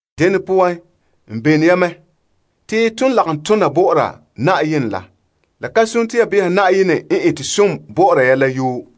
Dene poan, n belone ya mɛ te ton lagom tona bɔ'ɔra Na'ayenɛ la. La ka sone te ya beha Na'ayenɛ n ete som bɔ'ɔra ya la yoo.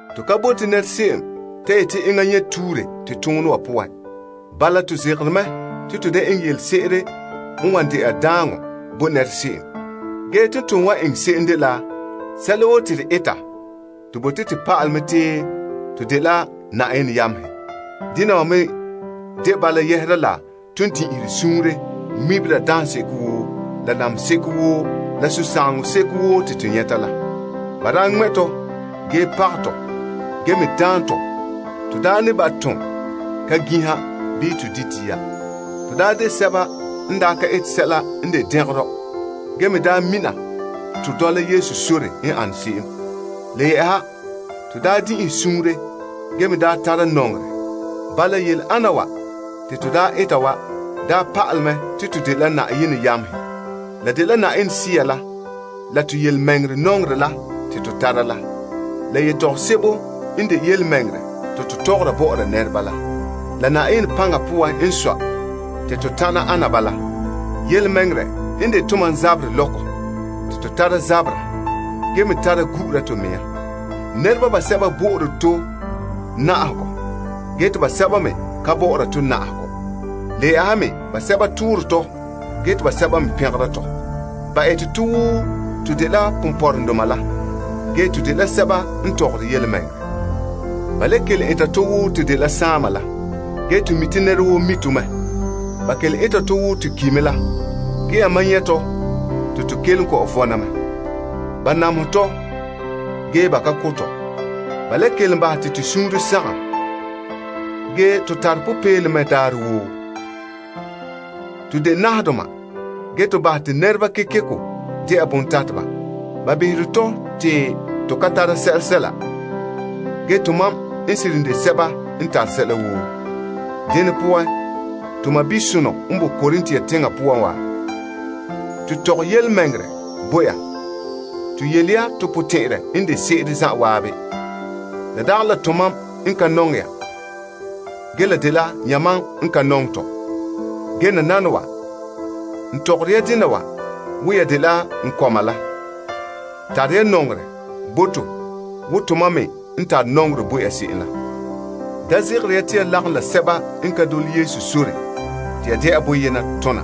To ka bote se'em ta yeti enŋa nyɛ tuure to toonɛ wa poan. Bala, to zegere mɛ te to da eŋɛ yelese'ere n wan dɛna daaŋɔ bo se'em. Ge te ton wan eŋɛ se'em dela la sɛla woo te to eta, to bote to pa'alɛ mɛ te to dela Na'ayenɛ yamehe. Yɛhera la ton din'inhe suunre ŋmebera daaŋseko woo, la namehe seko woo, la sunsagaŋɔ seko woo te to nyɛta la. Ba daa ŋmɛ' tɔ ge pagɛ tɔ ge me daan tɔ. To daa me ne ba' tom ka ginha bii di dia. To daa de sɛba n daa ka ete sɛla n de dɛngerɔ ge me daa mina to dɔla Yesu sore n ane se'em. Le yɛ'ɛha, to daa din'inhe suunre ge me daa tara nɔŋerɛ. Bala, yele ana wa te to daa eta wa daa pa'alɛ mɛ te to dela Na'ayenɛ yamehe. La dela Yenɛ Sea la, la to yelemɛŋɛrɛ nɔŋerɛ la te to tara la. yetɔgom sebo n de yelemɛŋɛrɛ te to tɔgɔra bɔ'ɔra nɛreba la, la Na'ayenɛ paŋa poan n sɔe te to tana ana bala la. Tontɔɔ vom n de tomam zaberɛ lɔkɔ te to tara zabera ge me tara gu'ura to mɛŋa. Nɛreba basɛba bo'ore to na'ahegɔ ge te basɛba me ka bo'ore to na'ahegɔ. Le yɛ'ɛha me basɛba toora tɔ gee te basɛba me pɛngera tɔ. Ba ete tɔ wo to dela ponpɔrɔŋdoma la, ge to dela sɛba n tɔgɔre yelemɛŋɛrɛ. Ba le kelom eta tɔ wo to dela saama la, ge to mi te nɛra woo mi to mɛ. Ba kelom eta tɔ wo to ki' mɛ la, ge yamam nyɛ' to la te to kelom kɔ'ɔn vɔna mɛ. Ba namehɛ tɔ, ge ba ka ko' tɔ. Ba le kelom bahɛ te to suunre sagom, ge to tare popeelom mɛ daarɛ woo. To de nahadoma, ge to bahɛ te nɛreba kekeko de'a bontateba. Ba behere tɔ te to ka tare sɛsɛla, ge to mam n seren de sɛba n tare sɛla woo. Dene poan, to sɔɔnrɔ sonɔ n boe Korint teŋa poan wa, to tɔgɛ yelemɛŋɛrɛ bo ya. To yele ya to potɛn'ya n de se'ere zan'an. La dagɛ la tomam n ka nɔŋɛ ya, ge la dela yamam n ka nɔŋɛ tɔ. Ge nananawa, n tɔgɔre ya dena wa wo ya dela n kɔma la. Tare ya nɔŋerɛ bo to wo tomam me n tare nɔŋerɛ bo ya se'em la. Da zegere ya te ya lagom la sɛba n ka dole Yesu sore te ya de'a boyena tona.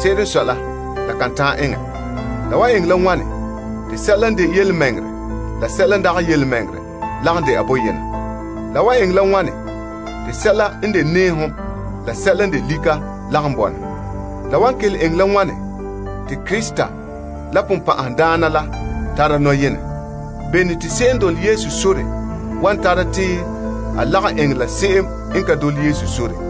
Se'ere n sɔe la, la kan ta'an eŋɛ. La wan eŋɛ la wane te sɛla n de yelemɛŋɛrɛ la sɛla n dagɛ yelemɛŋɛrɛ lagom dɛna boyena? La wan le eŋɛ la wane te sɛla n de nɛɛhom la sɛla n de lika lagom bɔna? La wan kelom eŋɛ la wane te Krista la Sagona la tara nɔyenɛ? Bene te se'em n dole Yesu sore wan tara te a lagom eŋɛ la se'em n ka dole Yesu sore?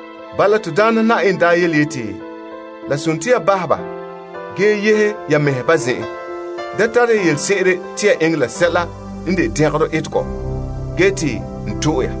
Bala, to Daana Na'ayenɛ daa yeti, Bahɛ ya ba! Yehe ya mɛhe ba zen'en. Da kalom ya sɛla n de dɛngerɔ, te n to'e ya.